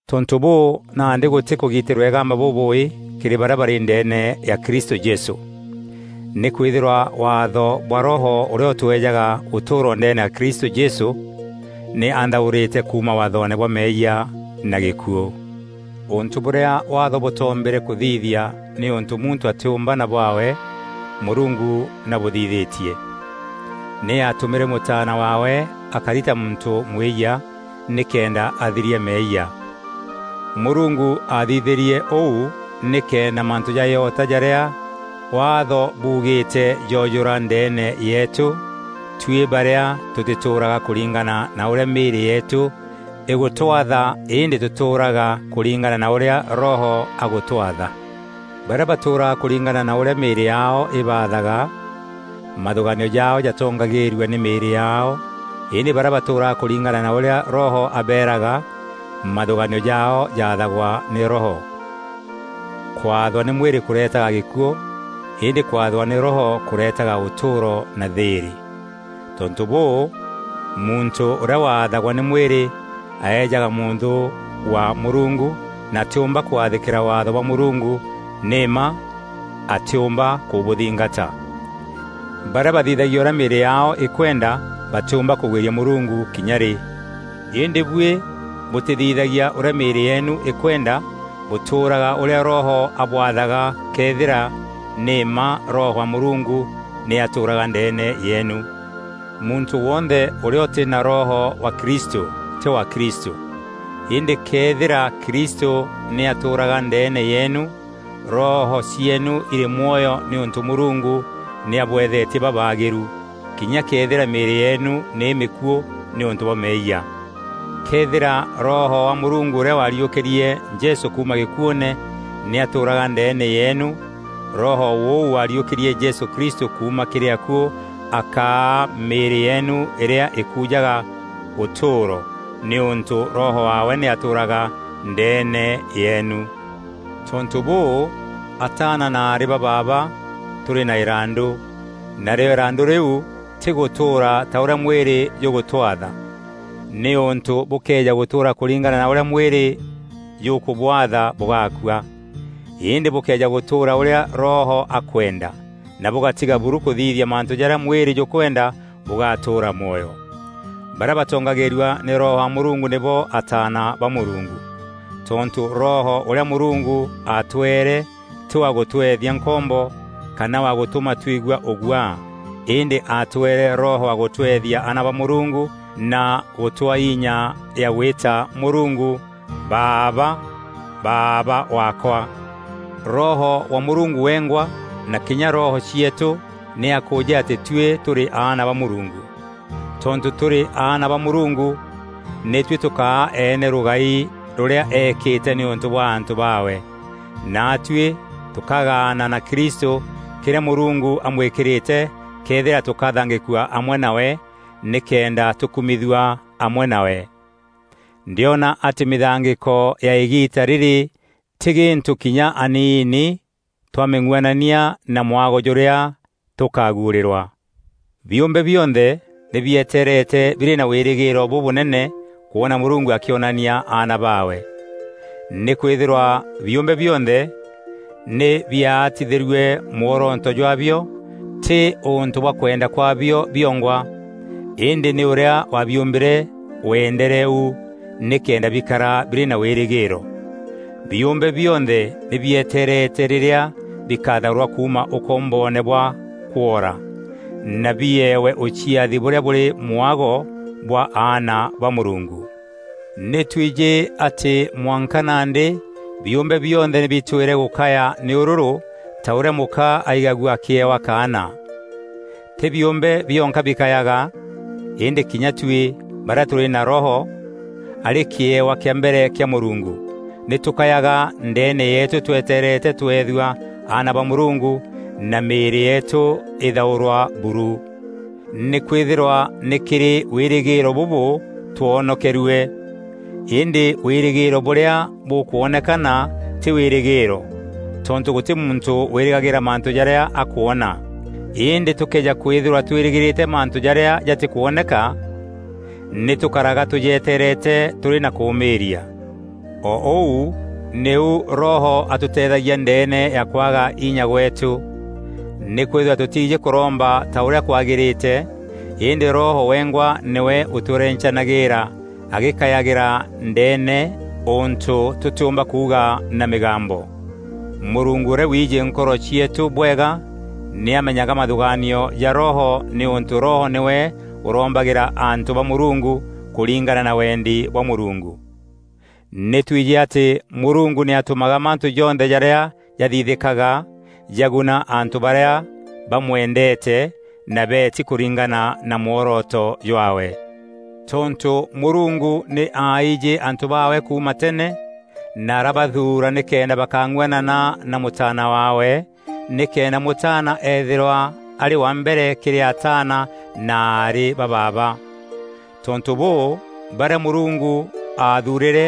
Tontû bûû, nandî gûtî kûgitîrwa îgamba bûbûûî kîrî barîa barî ndeene ya Kristû Jesû. Nîkwîthîrwa waatho bwa Roho ûrîa ûtweejaga ûtûûro ndeene ya Kristû Jesû, nî anthaûrîte kuuma waathoone bwa meeyia na gîkuû. Ûntû bûrîa Waatho bûtoombîre kûthithia nîûntû muntû atîûmba na bwaawe, Mûrungu nî abûthithîtie. Nî aatûmîre mûtaana waawe akari ta muntû mwîyia, nîkenda athiria meeyia. Mûrungu aathithîrie ûu nîkenda mantû ja îota jarîa Waatho buugîîte joojûra ndeene yeetû, tuî barîa tûtîtûûraga kûringana na ûrîa mîîrî yeetû îgûtwatha îndî tûtûûraga kûringana na ûrîa Roho agûtwatha. Barîa batûûraga kûringana na ûrîa mîîrî yaao îbaathaga, mathûgaanio jaao jatongagîîrua nî mîîrî yaao îndî barîa batûûraga kûringana na ûrîa Roho abeeraga, mathûgaanio jaao jaathagwa nî Roho. Kwathwa nî mwîrî kûretaga gîkuû, îndî kwathwa nî Roho kûretaga ûtûûro na thîîrî. Tontû bûû, muntû ûrîa wathagwa nî mwîrî aejaga mûnthû wa Mûrungu na atîûmba kwathîkîra Waatho bwa Mûrungu, nî mma atîûmba kûbûthingata. Barîa bathithagia ûrîa mîîrî yaao îkwenda batîûmba kûgwîria Mûrungu kinya rî. Îndî buî bûtîthithagia ûrîa mîîrî yeenu îkwenda, bûtûûraga ûrîa Roho abwathaga këethîra nî mma Roho wa Mûrungu nî atûûraga ndeene yeenu. Muntû wonthe ûrîa ûtî na Roho wa Kristû, tî wa Kristû. Îndî këethîra Kristû nî atûûraga ndeene yeenu, roho cieenu irî mwoyo nîûntû Mûrungu nî abûethetie babaagîru, kinya këethîra mîîrî yeenu nî îmîkuû nîûntû bwa meeyia. Këethîra Roho wa Mûrungu ûrîa waariûkîrie Jesû kuuma gîkuûne nî atûûraga ndeene yeenu, Roho ûu waariûkîrie Jesû Kristû kuuma kîrî akuû akaa mîîrî yeenu îrîa îkuujaga ûtûûro, nîûntû Roho waawe nî atûûraga ndeene yeenu. Tontû bûû, ataana na aarî ba baaba tûrî na îrandû, narîo îrandû rîu, tî gûtûûra ta ûrîa mwîrî jûgûtwatha, nîûntû bûkëeja gûtûûra kûringana na ûrîa mwîrî jûkûbwaatha bûgakua. Îndî bûkëeja gûtûûra ûrîa Roho akwenda na bûgatiga buru kûthithia mantû jarîa mwîrî jûkwenda, bûgatûûra mwoyo. Barîa batongagîîrua nî Roho wa Mûrungu nîbo ataana ba Mûrungu. Tontû Roho ûrîa Mûrungu aatweere tî wa gûtweethia nkombo, kana wa gûtûma twigua ûguaa, îndî aatweere Roho wa gûtweethia aana ba Mûrungu na gûtûa inya ya gwîta Mûrungu, “Baaba! Baaba waakwa!” Roho wa Mûrungu wengwa na kinya roho cieetû nî akûûjî atî tuî tûrî aana ba Mûrungu. Tontû tûrî aana ba Mûrungu, nî tuî tûkaa eene rûgai rûrîa eekîte nîûntû bwa antû baawe, naatuî tûkagaana na Kristû kîrîa Mûrungu amwîkîrîte këethîra tûkathangîkua amwe nawe nîkenda tûkumîthua amwe nawe. Ndîona atî mîthangîko ya îgiita rîrî tî gîntû kinya aniini, twamîng'uanania na mwago jûrîa tûkaguûrîrwa. Biûmbe bionthe nî bieteerete birî na wîrîgîîro bûbûnene kwona Mûrungu akîonania aana baawe. Nîkwîthîrwa biûmbe bionthe nî biaatithîrue mworoto jwaabio, tî ûntû bwa kwenda kwaabio biongwa, îndî nî ûrîa waabiûmbîre wendere u nîkenda bikara birî na wîrîgîîro. Biûmbe bionthe nî bieteerete rîrîa bikathaûrwa kuuma ûkomboone bwa kwoora, na biewe ûciathi bûrîa bûrî mwago bwa aana ba Mûrungu. Nî twijî atî mwanka nandî biûmbe bionthe nî bitwîre gûkaya nî ûrûrû, ta bûrîa mûka aigagua akîewa kaana. Tî biûmbe bionka bikayaga, îndî kinya tuî, barîa tûrî na Roho, arî kîewa kîa mbere kîa Mûrungu, nî tûkayaga ndeene yeetû tweteerete tweethua aana ba Mûrungu, na mîîrî yeetû îthaûrwa buru. Nîkwîthîrwa nî kîrî wîrîgîîro bûbû twoonokerue. Îndî wîrîgîîro bûrîa bûkwonekana tî wîrîgîîro. Tontû gûtî muntû wîrîgagîîra mantû jarîa akwona. Îndî tûkëeja kwîthîrwa twîrîgîrîte mantû jarîa jatîkwoneka, nî tûkaraga tûjetereete tûrî na kûûmîîria. O ûu nîu Roho atûteethagia ndeene ya kwaga inya gweetû. Nîkwîthîrwa tûtiijî kûromba ta ûrîa kwagîrîte, îndî Roho wengwa nîwe ûtwerencanagîîra agîkayagîra ndeene ûntû tûtîûmba kuuga na mîgambo. Mûrungu ûrîa wiijî nkoro cieetû bwega nî amenyaga mathûgaanio ja Roho nîûntû Roho nîwe ûrombagîra antû ba Mûrungu, kûringana na wendi bwa Mûrungu. Nî twijî atî Mûrungu nî atûmaga mantû jonthe jarîa jathithîkaga, jaguna antû barîa bamwendeete na beeti kûringana na mworoto jwaawe. Tontû Mûrungu nî aaijî antû baawe kuuma tene, na arabathuura nîkenda bakang'uanana na Mûtaana waawe, nîkenda Mûtaana eethîrwa arî wa mbere kîrî ataana na aarî ba baaba. Tontû bûû, barîa Mûrungu aathuurîre,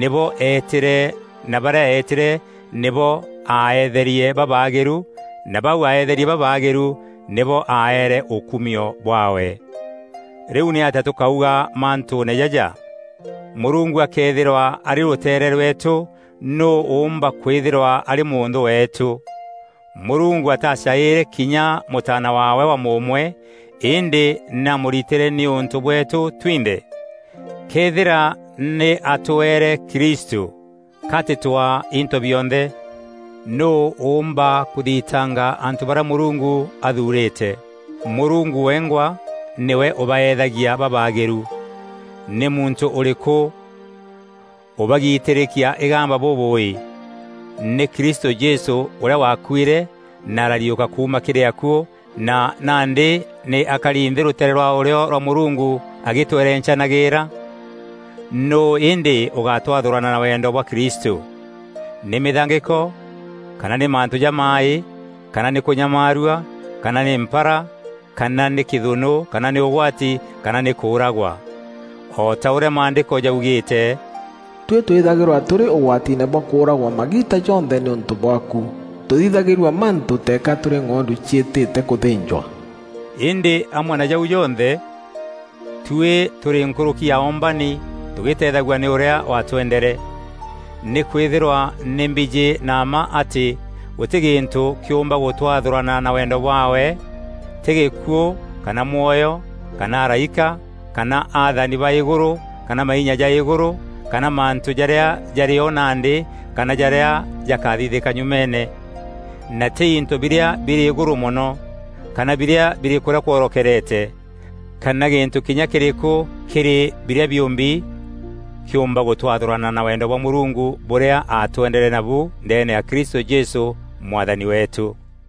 nîbo eetîre na barîa eetîre, nîbo aaeetherie babaagîru na bau aeetherie babaagîru, nîbo aaere ûkumio bwaawe. Rîu nîatîa tûkauga mantûûne jaja? Mûrungu akëethîrwa arî rûteere rweetû, nûû ûûmba kwîthîrwa arî mûnthû weetû? Mûrungu atacaîîre kinya Mûtaana waawe wa mûûmwe, îndî nî aamûritîre nîûntû bweetû twinthe. Këethîra nî aatweere Kristû, ka atîtûaa into bionthe? Nûû ûûmba kûthitanga antû barîa Mûrungu athuurîte? Mûrungu wengwa nîwe ûbaeethagia babaagîru. Nî muntû ûrîkû ûbagitîrîkia îgamba bûbûûî? Nî Kristû Jesû, ûrîa waakuîre na arariûka kuuma kîrî akuû na nandî nî akari nthî rûteere rwa ûrîo rwa Mûrungu agîtwerencanagîîra? Nûû îndî ûgatwathûrana na wendo bwa Kristû? Nî mîthangîko, kana nî mantû jamaaî, kana nî kûnyamaarua, kana nî mpara, kana nî kîthûnû kana nî ûgwati, kana nî kûûragwa? O ta ûrîa Maandîko jaugîîte, “Tuî twîthagîrwa tûrî ûgwatiine bwa kûûragwa magiita jonthe nîûntû bwaaku. Tûthithagîrua mantû teeka tûrî ng'ondu ciîtîte kûthînjwa.” Îndî amwe na jau jonthe, tuî tûrî nkûrûki ya oombani tugîîteethagua nî ûrîa waatwendere. Nîkwîthîrwa nî mbijî na mma atî gûtî gîntû kîûmba gûtwathûrana na wendo bwaawe; tî gîkuû, kana mwoyo, kana araîka, kana athani ba îgûrû kana mainya ja îgûrû, kana mantû jarîa jarî o nandî, kana jarîa jakathithîka nyumeene; na tî into birîa birî îgûrû mono kana birîa birî kûrîa kworokerete, kana gîntû kinya kîrîkû kîrî birîa biûmbi kîûmba gûtwathûrana na wendo bwa Mûrungu bûrîa aatwendere nabu ndeene ya Kristû Jesû Mwathani weetû.